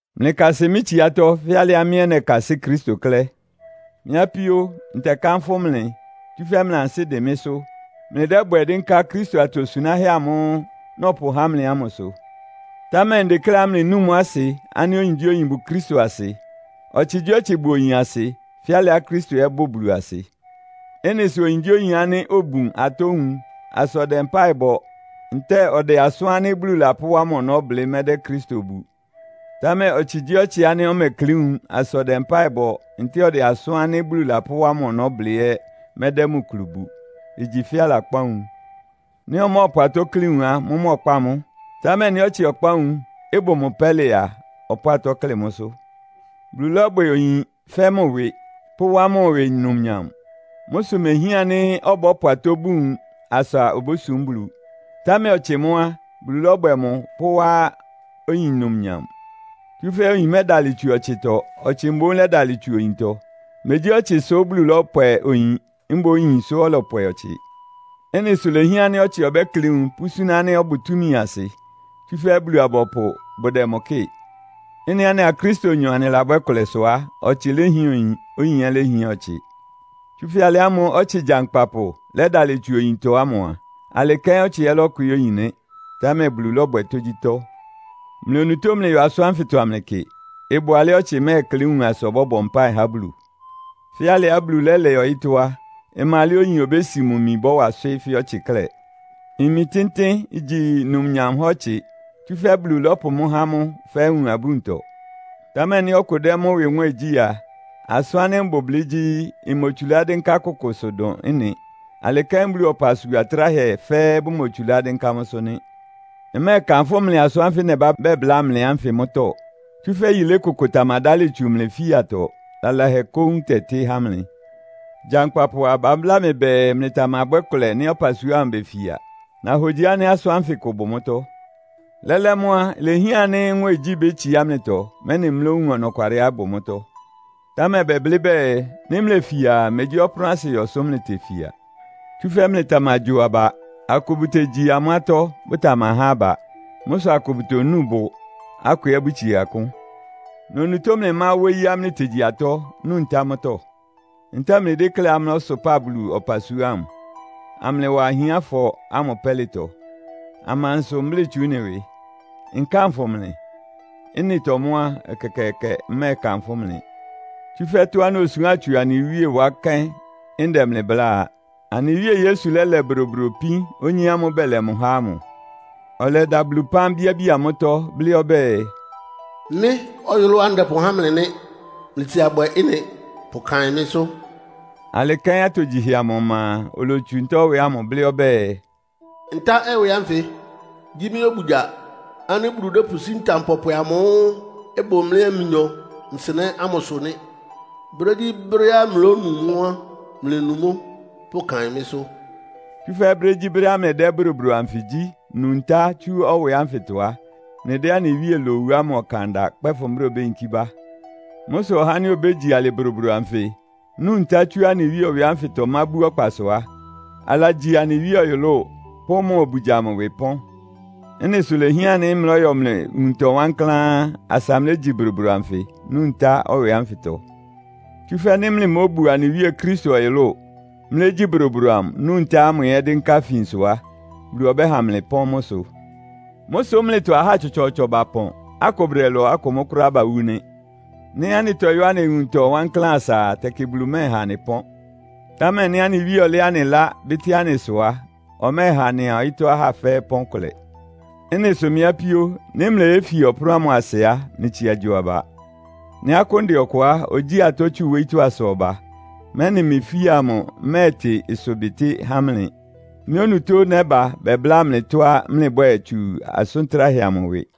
Mlɩkasɩ mɩ́ tsiátɔ́, fɛ́ alɩá mɩ́ ɛ́ nɛkasɩ́ Kristo klɛ́. Mɩ́ apíó, ntɛkánfʋ́ mlɩ, tsúfɛ́ mlɩ ansɩ́ dɩn mɩ́sʋ́. Mlɩdɛ́bwɛ dɩ́nká Kristo atosunáhɛ́ amʋ́ʋ́ nɔpʋhá mlɩ ámʋ sʋ. Támɛ ndekléá mlɩnúu mʋ́ asɩ ánɩ́ oyingyíoyin bʋ Kristo asɩ, ɔtsɩgyíɔtsɩ bʋ oyin asɩ, fɛ́ alɩá Kristo ɛ́ bʋ Bulu asɩ. Ɩ́nɩ sʋ oyingyíoyin ánɩ́ obun atɔ́ nwun asa ɔdɛ mpáɩ bɔ ntɛ́ɛ ɔdɛ asʋ́n ánɩ́ Bulu lapʋ́wá mʋ́ ɔnɔ́ blɩ́ mɛ́dɛ́ Kristo bu. Támɛ ɔtsɩgyíɔtsɩá ɔmɛklɩ́ nwun asa ɔdɛ mpáɩ bɔ ntɛ́ɛ ɔdɛ asʋ́n ánɩ́ Bulu lapʋ́wá mʋ ɔnɔ́ blɩ́ ɛ́ mɛ́dɛ́ mʋ kulu bu. Igyi fɛ́ alakpá nwun. Nɩ́ ɔmɔ́ɔpʋ atɔ́ klɩ́ nwun á, mʋ́mʋ́ ɔkpáa mʋ́. Támɛ nɩ́ ɔtsɩ ɔkpá nwun, ɩbʋ mʋ pɛ́lɩ a, ɔpʋ́ʋ atɔ́ klɩ́ mʋ́sʋ́. Bulu lɔ́bwɛ oyin fɛ́ mʋ ɩwɩ, pʋ́wá mʋ ɩwɩ numnyam. Mʋ́ sʋ mehián ánɩ́ ɔbɔ́pʋ atɔ́ bun nwun asa obósum Bulu. Támɛ ɔtsɩ mʋ́ á, Bulu lɔ́bwɛ mʋ pʋ́wá oyin numnyam. Tsúfɛ́ oyin mɛ́dalɩ tsu ɔtsɩtɔ, ɔtsɩ mboún lɛ́dalɩ tsú oyintɔ. Megyí ɔtsɩ sʋ́ Bulu lɔ́pwɛ oyin, mboún oyin sʋ́ ɔlɔpwɛ ɔtsɩ. Ɩ́nɩ sʋ ilehián ánɩ́ ɔtsɩ ɔbɛ́klɩ́ nwun, pʋ́súná ánɩ́ ɔbʋ túmi asɩ, tsúfɛ́ Bulu-abɔpʋ bʋdɛ mʋ kɩ́ɩ. Ɩ́nɩá anɩa Kristonyɔ anɩlabwɛ́ kʋlɛ sʋ á, ɔtsɩ léhián oyin, oyin ɛ́ léhián ɔtsɩ. Tsúfɛ́ alɩ ámʋ́ʋ́ ɔtsɩ gyankpapʋ lɛ́dalɩ tsu oyintɔ ámʋ a, alɩ kɛ́n ɔtsɩ ɛ́ lɔ́kwɩɩ́ oyin nɩ́. Támɛ Bulu lɔ́bwɛ tógyítɔ́. Mlɩ onutó mlɩyɔ asʋ́n ánfɩtɔ amlɩkɩ. Ɩbʋ alɛ́á ɔtsɩ mɛ́ɛklɩ́ nwun asa ɔbɔ́bɔ mpáɩ há Bulu? Fɛ́ alɩá Bulu lɛ́lɛ ɔyɩ́tɔ́ á, ɩma alɛ́á oyin obési mʋ imi ɩbɔ́wa ɩswɩ́ fɛ́ ɔtsɩ klɛ́. Imi tɩ́ntɩ́n igyi numnyam há ɔtsɩ, tsúfɛ́ Bulu lɔ́pʋ mʋ́ há mʋ fɛ́ nwun-abúntɔ. Támɛ nɩ́ ɔkʋ dɛ́ mʋ́ ɩwɩ nwɛ́ɛn gyí a, asʋ́n ánɩ́ mbʋ blɩ́ gyí, mmotsulá dɩ́nká kʋkʋsʋ dʋn ɩ́nɩ. Alɩ kɛ́n Bulu ɔpasua atráhɛ fɛ́ɛ́ bʋmotsulá dɩ́nká mʋ́sʋ́ nɩ́. Mmɛ́ɛkanfʋ́ mlɩ asʋ́n ánfɩ nɛbá bɛbláa mlɩ ánfɩ mʋ́tɔ́. Tsúfɛ́ yilé kʋkʋ tamadálɩ tsu mlɩ ifíatɔ. Lalahɛ kóún ɩtɛtɩ́ há mlɩ. Gyankpapʋ a, babláa mɩ bɛɛ mlɩtamabwɛ́ kʋlɛ nɩ́ ɔpasua ámʋ befia. Nahogyi ánɩ́ asʋ́n ánfɩ kʋ bʋ mʋ́tɔ́. Lɛ́lɛ́ mʋ́ á, ilehián ánɩ́ nwɛ́ɛngyí bétsiá mlɩtɔ, mɛ́nɩ mlówun ɔnɔkwalɩá ɩbʋ mʋ́tɔ́. Támɛ bɛblɩ́ bɛɛ, nɩ́ mlefia a, megyí ɔpʋ́nʋ́asɩyɔ sʋ mlɩtefia. Tsúfɛ́ mlɩtamagyo aba. Akʋ bʋtegyi amʋ́ atɔ́, bʋtamahá aba. Mʋ́ sʋ akʋ bʋtonu bʋ, akʋ ɛ́ bʋtsie akʋ́n. Mlɩ onutó mlɩmá wóyíá mlɩtegyi atɔ́, nu ntá mʋ́tɔ́? Ntɛ́ɛ mlɩdékléá mlɔ́sʋpáa Bulu ɔpasua ámʋ, amlɩwa ahiánfɔ ámʋ pɛ́lɩtɔ? Amansʋ mblɩ́ tsu ɩ́nɩ ɩwɩ? Nkánfʋ mlɩ? Ɩ́nɩtɔ mʋ́ á, ɛkɛkɛɛkɛ, mmɛ́ɛkanfʋ́ mlɩ! Tsúfɛ́ tɔ́á nosuán tsu anɩ Wíe wá kɛ́n ndɛ mlɩ bláa a. Anɩ Wíe Yesu lɛ́lɛ bodobodo ipín onyé ámʋ́ʋ́ bɛlɛ mʋ há ámʋ, ɔlɛda Bulu ɩpán, bíábía mʋ́tɔ́, blɩ́ ɔbɛ́ɛ, “Mɩ́ ɔyʋlʋ́á ndɛpʋhá mlɩ nɩ́. Mlɩtsia bwɛ ɩ́nɩ pʋkaɩn mɩ́sʋ́.” Alɩ kɛ́n atogyihɛ amʋ ɔma a, olotsu ntá-ɛwɛ ámʋ, blɩ́ ɔbɛ́ɛ, “Ntá-ɛwɛ ánfɩ gyí mɩ́ obugya ánɩ́ Bulu dɛ́pʋsí ntam pɔpwɛ amʋ́ʋ́ ɩbʋ mlɩa mʋnyɔ nsɩnɛ́ ámʋsʋ nɩ́. Brégyíbrɛ́á mlónu mʋ́ á, mlɩnu mʋ́ pʋkaɩn mɩ́sʋ́.” Tsúfɛ́ brégyíbrɛ́á mlɩdɛ́ bodobodo anfɩ gyí, nu ntá tsú ɛwɛ ánfɩtɔ á, mlɩdɛ́ anɩ Wíe lowu ámʋ ɔkan da kpɛ́fʋn brɛ́á obéyinkí bá. Mʋ́ sʋ ɔhá ánɩ́ obégyi alɩ bodobodo anfɩ, nu ntá tsú anɩ Wíe ɛwɛ ánfɩtɔ mábú ɔkpasʋ á, alagyi anɩ Wíe ɔyʋlʋ́ʋ pʋ́ mʋ obugya amʋ ɩwɩ pɔ́n. Ɩ́nɩ sʋ ilehián ánɩ́ mlɔ́yɔ mlɩ nwuntɔ wankláán, asa mlégyi bodobodo anfɩ, nu ntá-ɛwɛ ánfɩtɔ. Tsúfɛ́ nɩ́ mlɩmóbu anɩ Wíe Kristo ɔyʋlʋ́ʋ, mlɩlégyí bodobodo amʋ, nu ntá ámʋ ɛ́ dɩ́nká ifinsʋ á, Bulu ɔbɛ́ha mlɩ ɩpɔ́n mʋ́ sʋ. Mʋ́ sʋ́ mlɩtɔ ahá tsɔtsɔɔtsɔ bapɔn, akʋ bʋdɛlɔ, akʋ mʋ́ kʋ́ráá bawú nɩ́. Nɩ́ anɩtɔyɔ́ anɩ nwuntɔ wankláán asa a, tɛkɩ Bulu mɛ́ɛha anɩ pɔ́n. Támɛ nɩ́ anɩ Wíe ɔlɛ́ anɩ ɩlá, bɩ́tɩ́ anɩ ɩsʋ á, ɔmɛ́ɛha anɩa ɔyɩ́tɔ́ ahá fɛ́ɛ́ ɩpɔ́n kʋlɛ. Ɩ́nɩ sʋ mɩ́ apíó, nɩ́ mleyéfia ɔpʋ́nʋ́ ámʋ asɩ á, mlɩtsia gyo aba. Nɩ́ akʋ́n dɛ ɔkʋ á, ogyíi atɔ́ tsu wóyítɔ́ asa ɔba, mɛ́nɩ mlɩ ifía amʋ ɩmɛ́ɛtɩ ɩsʋbɩtɩ́ há mlɩ. Mɩ́ onutó nɛ́ba bɛbláa mlɩ tɔ́á mlɩbwɛ́ɛ tsu asʋn tráhɛ amʋ ɩwɩ.